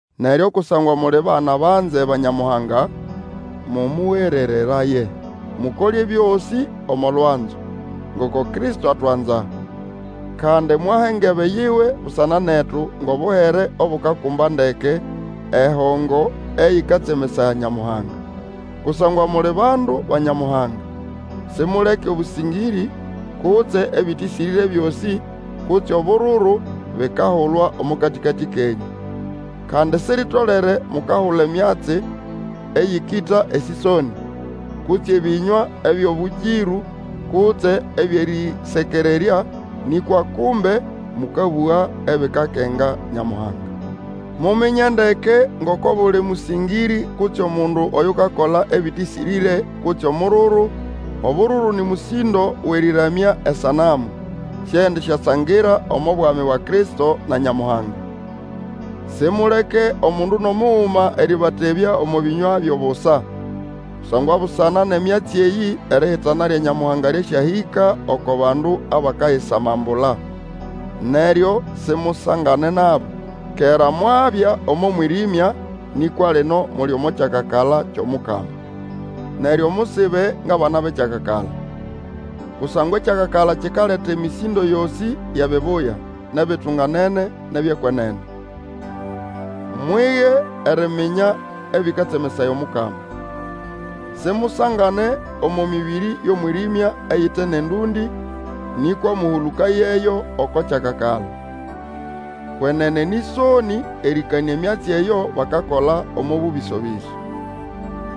Neryo kusangwa muli bana banze ba Nyamuhanga, mũmũgerereraye. Mukole ebyosĩ omo lwanzo, ngoko Kristo atwanza, kandi mwaha engebe yiwe busana netu ngʼobuhere obukakumba ndeke, ehongo eyĩkatsemesaya Nyamuhanga. Kusangwa muli bandu ba Nyamuhanga, simuleke obũsĩngĩrĩ, kutse ebĩtĩsĩrĩre byosĩ, kutse obururu, bikahulwa omo katĩkatĩ kenyũ. Kandi siritolere mukahula emyatsi eyĩkĩta esĩsonĩ, kutse ebĩnywa ebyʼobũkĩrũ kutse ebyʼerĩsekererya, nĩkwa kumbe mũkabũga ebikakenga Nyamuhanga. Muminye ndeke ngoko obuli mũsĩngĩrĩ, kutse omundu oyukakola ebĩtĩsĩrĩre, kutse omururu, (obururu nĩ mũsĩndo wʼerĩramya esanamu), siendisyasangira omo bwami bwa Kristo na Nyamuhanga. Simuleke omundu nʼomuguma erĩbatebya omo bĩnywa byʼobusa. Kusangwa busana nʼemyatsi eyĩ erihitana lya Nyamuhanga lyasyahĩka oko bandu abakayisamambula. Neryo simusangane nabo. Kera mwabya omo mwĩrĩmya, nĩkwa lino muli omo kyakakala kyʼomukama. Neryo musibe ngʼabana bʼekyakakala. (Kusangwa ekyakakala kikaleta emĩsĩndo yosĩ yʼebibuya, nʼebitunganene, nʼebyʼekwenene). Mwige eriminya ebĩkatsemesaya Omukama. Simusangane omo mĩbĩrĩ yʼomwĩrĩmya eyite nʼendũndĩ, nĩkwa mũhũlũkayeyo oko kyakakala. Kwenene nĩ ʼsonĩ erĩkanĩa emyatsi eyo bakakola omo bũbĩso-bĩso.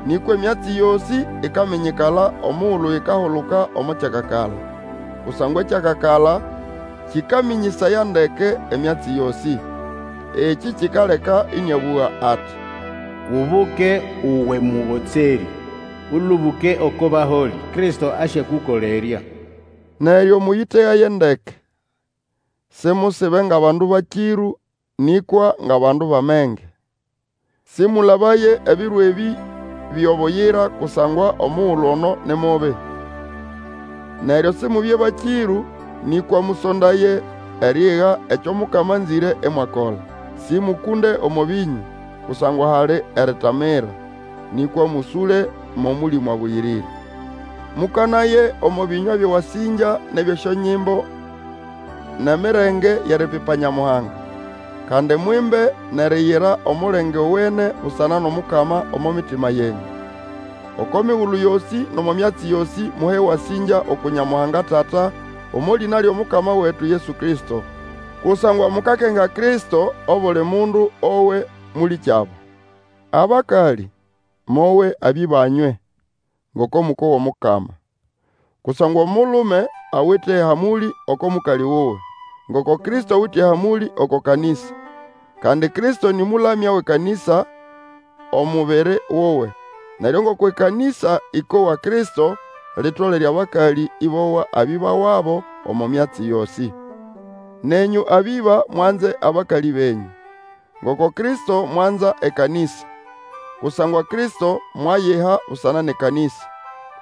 Nĩkwa emyatsi yosĩ ikaminyikala omugulu ikahuluka omo kyakakala; kusangwa ekyakakala kĩkamĩnyĩsaya ndeke emyatsi yosĩ. Ekĩ kikaleka ĩnĩabũga ati, Ubuke, uwe mũgotserĩ, Ũlũbũke oko baholĩ! Kristo asyakũkolerya. Neryo, mũyĩtegaye ndeke, simusibe ngʼabandu bakĩrũ, nĩkwa ngʼabandu bʼamenge. Sĩmũlabaye ebiro ebĩ byo buyira kusangwa omugulu ono ni mubi. Neryo Simubye bakĩrũ, nĩkwa mũsondaye eriiga ekyo Mukama anzĩre imwakola. Sĩmũkũnde omo bĩnyũ, kusangwa hali eritamira, nĩkwa mũsũle mʼOmũlĩmũ Abũyĩrĩre. Mũkanaye omo bĩnywa byʼewasĩngya nʼebyʼesyonyimbo nʼemirenge yʼeripipa Nyamuhanga, kandi mwimbe nʼeriyira omulenge owene busana nʼomukama omo mitima yenyũ. Oko migulu yosĩ nʼomo myatsi yosĩ muhe ewasĩngya uku Nyamuhanga Tata, omo lĩna lyʼomukama wetu Yesu Kristo. Kusangwa mukakenga Kristo, obuli mundu owe mũlĩkyabo. Abakalĩ, mowe abĩba nywe, ngoko mũkowa Omukama. Kusangwa omulume awite ehamũlĩ oko mũkalĩ wuwe, ngoko Kristo awite ehamũlĩ oko kanĩsa. Kandi Kristo nĩ mũlamya wʼekanĩsa omubiri wuwe. Neryo ngoko ekanĩsa ĩkowa Kristo, litolere abakalĩ ĩbowa abĩba wabo omo myatsi yosĩ. Nenyũ abĩba, mwanze abakalĩ benyũ, ngoko Kristo mwanza ekanĩsa. Kusangwa Kristo mwayiha busana nʼekanĩsa,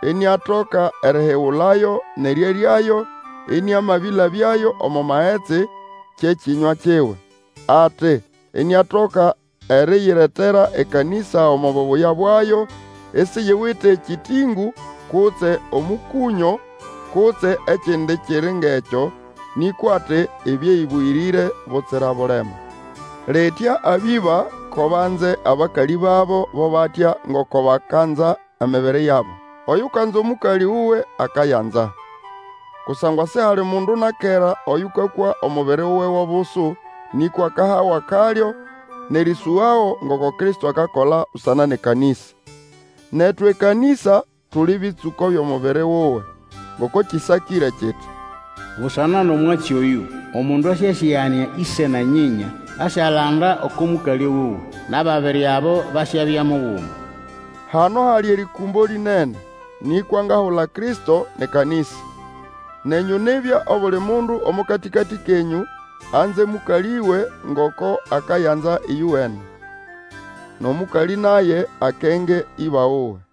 iniatoka erihigulayo nʼerĩeryayo ĩnĩamabĩlabyayo omo magetsi, kye kĩnywa kiwe. Ati, iniatoka eriyiretera ekanĩsa omo bubuya bwayo, isiyiwite ekĩtĩngũ kutse omũkũnyo kutse ekindi kiri ngʼekyo; nĩkwa ati, ibye ĩbũyĩrĩre butsira bulema. Litya abĩba ko banze abakalĩ babo bo batya ngoko bakanza emibiri yabo. Oyukanza omũkalĩ wuwe akayanza. Kusangwa sihali mundu na kera Oyũkakwa omubiri wuwe gʼobusu, nĩkwa akahago akalyo nʼerĩsũgago, ngoko Kristo akakola busana nʼekanĩsa. Netu ekanĩsa, tuli bĩtsũko byʼomubiri wuwe. Ngoko kĩsakĩre kiti, Busana nʼomwatsi oyu omundu asyasĩganĩa ĩse na nyĩnya, asyalanda oko mũkalĩ wuwe, nʼababiri abo basyabya muguma. Hano hali erĩkũmbo lĩnene; nĩkwa ngahula Kristo nʼekanĩsa. Nenyũ nibya, obuli mundu omo katĩkatĩ kenyũ anze mũkalĩwe ngoko akayanza ĩyowene; nʼomũkalĩ naye akenge ĩba wuwe.